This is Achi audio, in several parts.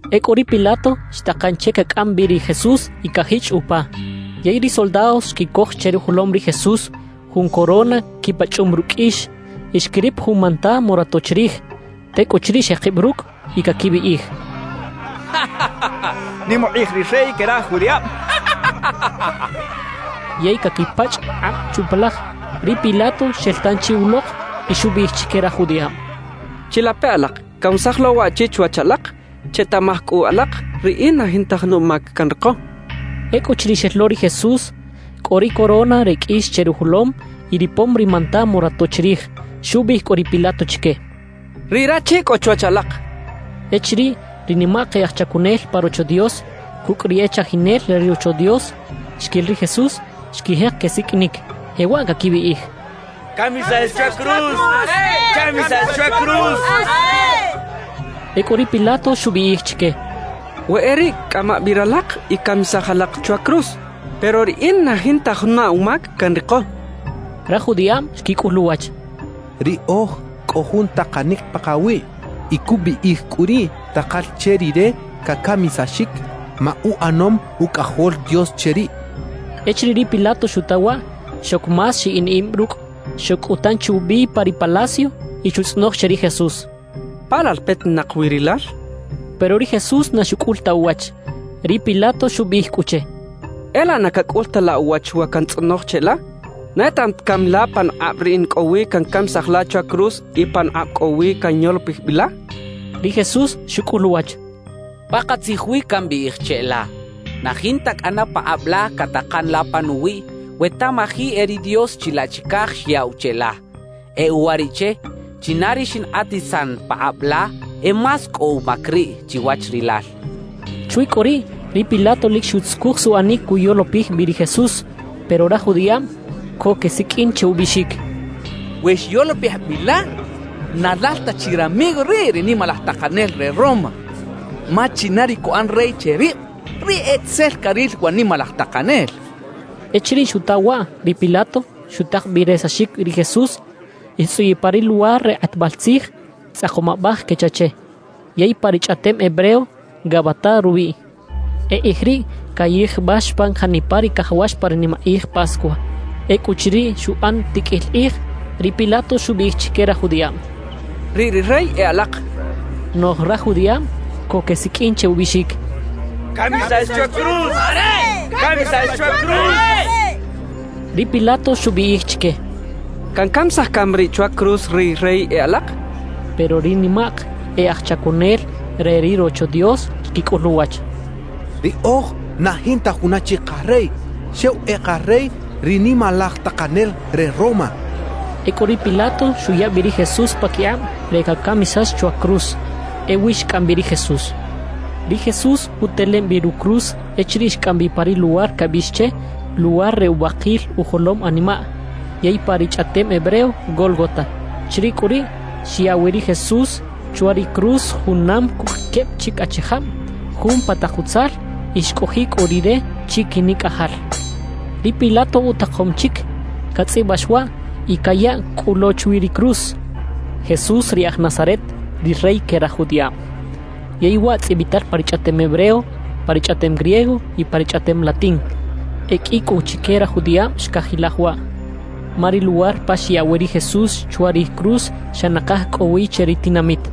Ekꞌu ri Pilato xtaqan che kakꞌam bꞌi ri Jesús y kajichꞌ upa. Yey ri soldados xkikoj che rujolom ri Jesús jun corona kipachꞌum rukꞌ kꞌiix. Y xkirip jun manta morato chirij. Tekꞌuchiriꞌ xeqibꞌ rukꞌ y kakibꞌiꞌij: —¡Nim uqꞌij ri rey ke raj judiꞌabꞌ! —kechaꞌ. Yey kakipachꞌ qꞌabꞌ chupalaj. Ri Pilato xel tanchi uloq y xubꞌiꞌij chike raj judiꞌabꞌ: —Chilape alaq, kanwesaj lo waꞌchi chiwach alaq. Chetaꞌmaj kꞌu alaq, riꞌin na jinta juna umak kanriqo —xchaꞌ. Ekꞌuchiriꞌ xel lo ri Jesús, kꞌo ri corona re kꞌiix che rujolom y ripom ri manta morato chirij. Xubꞌiꞌij kꞌu ri Pilato chike: —¡Riꞌ rachi kꞌo chiwach alaq! —xchaꞌ. Echiriꞌ ri nimaq e aj chakunel pa Rocho Dios kukꞌ ri e chajinel re ri Rocho Dios xkil ri Jesús, xkijeq kesikꞌinik, jewaꞌ kakibꞌiꞌij: —¡Kamisax chwa cruz! ¡Kamisax chwa cruz! —kechaꞌ. Ekꞌu ri Pilato xubꞌiꞌij chike: —We e riꞌ, kꞌama bꞌi ralaq y kamisaj alaq chwa cruz, pero riꞌin na jinta juna umak kanriqo —xchaꞌ. Raj judiꞌabꞌ xkikꞌul uwach: —Riꞌoj kꞌo jun taqanik paqawiꞌ y kubꞌiꞌij kꞌu riꞌ taqal che rire kakamisaxik ma uꞌanom Ukꞌajol Dios che ribꞌ —xechaꞌ. Echiriꞌ ri Pilato xuta waꞌ, xok más xiꞌin ibꞌ rukꞌ. Xok kꞌu tanchi ubꞌi pa ri palacio y xutzꞌonoj che ri Jesús: —¿Pa lal petinaq wi rilal? —xchaꞌ. Pero ri Jesús na xukꞌul ta uwach. Ri Pilato xubꞌiꞌij kꞌu che: —¿E laꞌ na kakꞌul ta la uwach wa kantzꞌonoj cheꞌla? ¿Na etaꞌam ta kami la panuqꞌabꞌ riꞌin kꞌo wi kankamisaj la chwa cruz y panuqꞌabꞌ kꞌo wi kanyolopij bꞌi la? —xchaꞌ. Ri Jesús xukꞌul uwach: —Paqatzij wi kambꞌiꞌij cheꞌla, na jinta kꞌana paqꞌabꞌ la kataqan la panuwiꞌ we tamaji e ri Dios chilaꞌ chikaj xyaꞌw cheꞌla. E uwariꞌche, china ri xinqꞌatisan paqꞌabꞌ la, e más kꞌo umak riꞌ, chiwach rilal —xchaꞌ. Chwi kꞌu riꞌ, ri Pilato lik xutzukuj suꞌanik kuyolopij bꞌi ri Jesús. Pero raj judiꞌabꞌ ko kesikꞌin che ubꞌiꞌxik: —¡We xyolopij bꞌi la, na lal ta chi ramigo riꞌ ri nimalaj taqanel re Roma; ma china ri kuꞌan rey che ribꞌ, riꞌ e tzel karil wa nimalaj taqanel! —xechaꞌ. Echiriꞌ xuta waꞌ ri Pilato, xutaq bꞌi resaxik ri Jesús y xtzꞌuyiꞌ pa ri luwar re qꞌatbꞌal tzij “Tzꞌaqom Abꞌaj” kecha che, yey pa ri chꞌaꞌtem hebreo “Gabatá” rubꞌiꞌ. E qꞌij riꞌ kayijbꞌax pan janipa ri kajawax pa ri nimaqꞌij Pascua. Ekꞌuchiriꞌ xuꞌan tikꞌil qꞌij, ri Pilato xubꞌiꞌij chike raj judiꞌabꞌ: —Riꞌ ri rey e alaq —xchaꞌ. Noꞌj raj judiꞌabꞌ ko kesikꞌin che ubꞌiꞌxik: —¡Kamisax chwa cruz! ¡Kamisax chwa cruz! —kechaꞌ. Ri Pilato xubꞌiꞌij chike: —¿Kankamisaj kami riꞌ chwa cruz ri rey e alaq? —xchaꞌ. Pero ri nimaq e aj chakunel re ri Rocho Dios xkikꞌul uwach: —Riꞌoj na jinta juna chik qarey, xew e qarey ri nimalaj taqanel re Roma —xechaꞌ. Ekꞌu ri Pilato xuya bꞌi ri Jesús pakiqꞌabꞌ re kakamisax chwa cruz. Ewi xkꞌam bꞌi ri Jesús. Ri Jesús utelem bꞌi rucruz echiriꞌ xkꞌam bꞌi pa ri luwar kabꞌiꞌx che “Luwar re Ubꞌaqil Ujolom Animaꞌ”, yey pa ri chꞌaꞌtem hebreo, “Gólgota”. Chiriꞌ kꞌu riꞌ xyaꞌ wi ri Jesús chwa ri cruz junam kukꞌ kebꞌ chik achijabꞌ, jun pa taq utzal; y xkꞌojiꞌ kꞌu Rire chikinikꞌajal. Ri Pilato utaqom chik katzꞌibꞌax waꞌ y kayaꞌ kꞌu lo chwi ri cruz: «JESÚS RI AJ NAZARET, RI REY KE RAJ JUDIꞌABꞌ.» Yey waꞌ tzꞌibꞌital pa ri chꞌaꞌtem hebreo, pa ri chꞌaꞌtem griego y pa ri chꞌaꞌtem latín. E kꞌi kꞌu chike raj judiꞌabꞌ xkajilaj waꞌ, ma ri luwar pa xyaꞌ wi ri Jesús chwa ri cruz xa naqaj kꞌo wi che ri tinamit.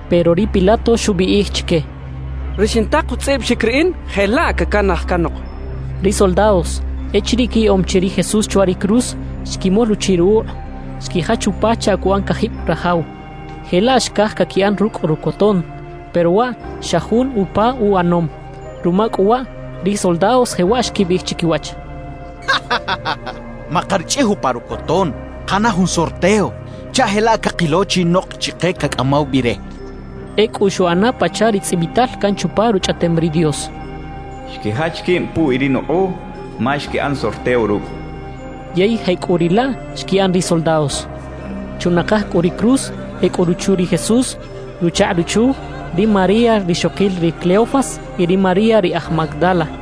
Pero ri Pilato xubꞌiꞌij chike: —Ri xintaq utzꞌibꞌaxik riꞌin, jelaꞌ kakanaj kanoq —xchaꞌ. Ri soldados echiriꞌ kiyaꞌom chi ri Jesús chwa ri cruz, xkimol uchiꞌ ruqꞌuꞌ, xkijach upa chaꞌ kuꞌan kajibꞌ rajaw. Jelaꞌ xkaj kakiꞌan rukꞌ rukoton; pero waꞌ xa jun upa uꞌanom. Ruma kꞌu waꞌ, ri soldados jewaꞌ xkibꞌiꞌij chikiwach: —Maqarichꞌij upa rukoton; qaꞌana jun sorteo chaꞌ jelaꞌ kaqilo chinoq chiqe kakꞌamaw bꞌi re —xechaꞌ. Ekꞌu xuꞌana pachaꞌ ri tzꞌibꞌital kan chupa Ruchꞌaꞌtem ri Dios: Xkijach kibꞌ puwi ri nuqꞌuꞌ, ma xkiꞌan sorteo rukꞌ kachaꞌ. Yey jekꞌuriꞌlaꞌ xkiꞌan ri soldados. Chunaqaj kꞌu ri cruz e kꞌo ruchu ri Jesús, ruchaqꞌ ruchu, ri María rixoqil ri Cleofas y ri María ri aj Magdala.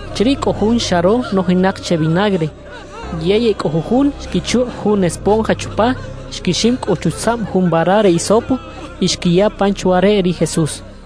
Chiriꞌ kꞌo jun xaro nojinaq che vinagre. Yey e kꞌo jujun xkichuqꞌ jun esponja chupa, xkixim kꞌu chutzaꞌm jun vara re hisopo y xkiya pan chwa reꞌ ri Jesús.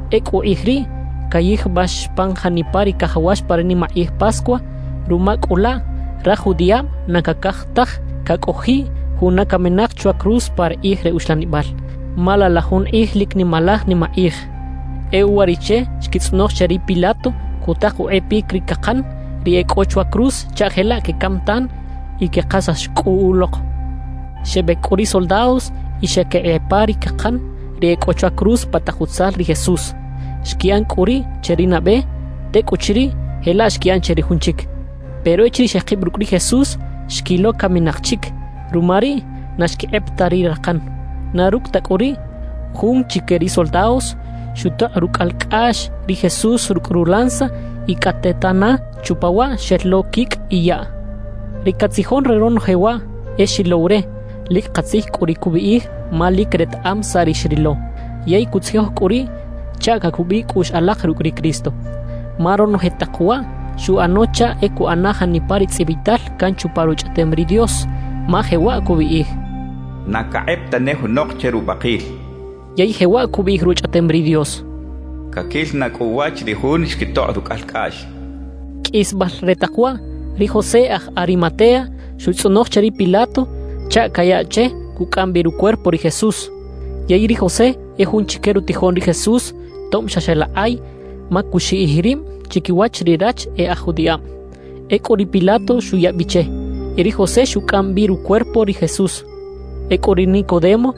Ekꞌu qꞌij riꞌ kayijbꞌax pan janipa ri kajawax pa ri nimaqꞌij Pascua. Ruma kꞌu laꞌ, raj judiꞌabꞌ na kakaj taj kakꞌojiꞌ juna kaminaq chwa cruz pa ri qꞌij re uxlanibꞌal, ma laꞌ la jun qꞌij lik nimalaj nimaqꞌij. E uwariꞌche xkitzꞌonoj che ri Pilato kutaq uqꞌepik ri kaqan ri e kꞌo chwa cruz chaꞌ jelaꞌ kekam tan y keqasax kꞌu uloq. Xebꞌek kꞌu ri soldados y xeꞌkiqꞌepa ri kaqan ri e kꞌo chwa cruz pa taq utzal ri Jesús. Xkiꞌan kꞌu riꞌ che ri nabꞌe, tekꞌuchiriꞌ jelaꞌ xkiꞌan che ri jun chik. Pero echiriꞌ xeqibꞌ rukꞌ ri Jesús, xkilo kaminaq chik; ruma riꞌ, na xkiqꞌep ta ri raqan. Na rukꞌ ta kꞌu riꞌ, jun chike ri soldados xutoqꞌ rukꞌalkꞌaꞌx ri Jesús rukꞌ rulanza y kꞌatetana chupa waꞌ xel lo kikꞌ y yaꞌ. Ri katzijon re ronoje waꞌ e xilow re; lik qatzij kꞌu ri kubꞌiꞌij ma lik retaꞌam saꞌ ri xrilo. Yey kutzijoj kꞌu riꞌ chaꞌ kakubꞌiꞌ kꞌuꞌx alaq rukꞌ ri Cristo. Ma ronoje taq waꞌ xuꞌano chaꞌ e kuꞌana janipa ri tzꞌibꞌital kan chupa Ruchꞌaꞌtem ri Dios, ma jewaꞌ kubꞌiꞌij: Na kaqꞌep tane junoq che rubꞌaqil. Yey jewaꞌ kubꞌiꞌij Ruchꞌaꞌtem ri Dios: Kakil na kꞌu uwach ri jun xkitoqꞌ rukꞌalkꞌaꞌx. Kꞌisbꞌal re taq waꞌ, ri José aj Arimatea xuꞌtzꞌonoj che ri Pilato chaꞌ kayaꞌ che kukꞌam bꞌi rucuerpo ri Jesús. Yey ri José e jun chike rutijoꞌn ri Jesús tobꞌ xa xeꞌlaqꞌay, ma kuxiꞌij ribꞌ chikiwach ri rach e aj judiꞌabꞌ. Ekꞌu ri Pilato xuya bꞌi che, y ri José xukꞌam bꞌi rucuerpo ri Jesús. Ekꞌu ri Nicodemo,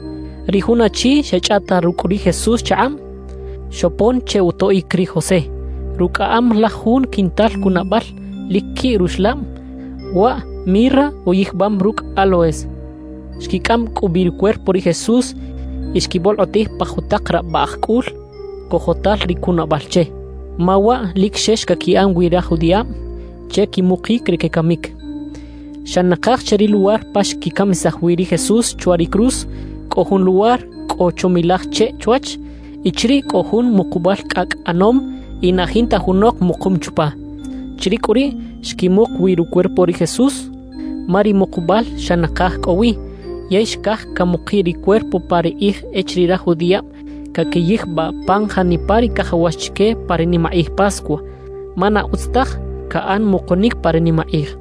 ri jun achi xeꞌchꞌaꞌta rukꞌ ri Jesús chaqꞌabꞌ, xopon che utoꞌik ri José. Rukꞌaꞌam laj jun quintal kunabꞌal lik kiꞌ ruxlabꞌ, waꞌ mirra uyijbꞌam rukꞌ áloes. Xkikꞌam kꞌu bꞌi rucuerpo ri Jesús y xkibꞌolqꞌotij pa jutaq rabꞌaꞌj kꞌul kojotal ri kunabꞌal che, ma waꞌ lik xex kakiꞌan wi raj judiꞌabꞌ che kimuqik ri kekamik. Xa naqaj che ri luwar pa xkikamisaj wi ri Jesús chwa ri cruz, kꞌo jun luwar kꞌo chomilaj cheꞌ chwach. Y chiriꞌ kꞌo jun muqubꞌal kꞌakꞌ ꞌanom, y na jinta junoq muqum chupa. Chiriꞌ kꞌu riꞌ xkimuq wi rucuerpo ri Jesús, ma ri muqubꞌal xa naqaj kꞌo wi; yey xkaj kamuqiꞌ ri cuerpo pa ri qꞌij echiriꞌ raj judiꞌabꞌ kakiyijbꞌaꞌ pan janipa ri kajawax chike pa ri nimaqꞌij Pascua, ma na utz taj kaꞌan muqunik pa ri nimaqꞌij.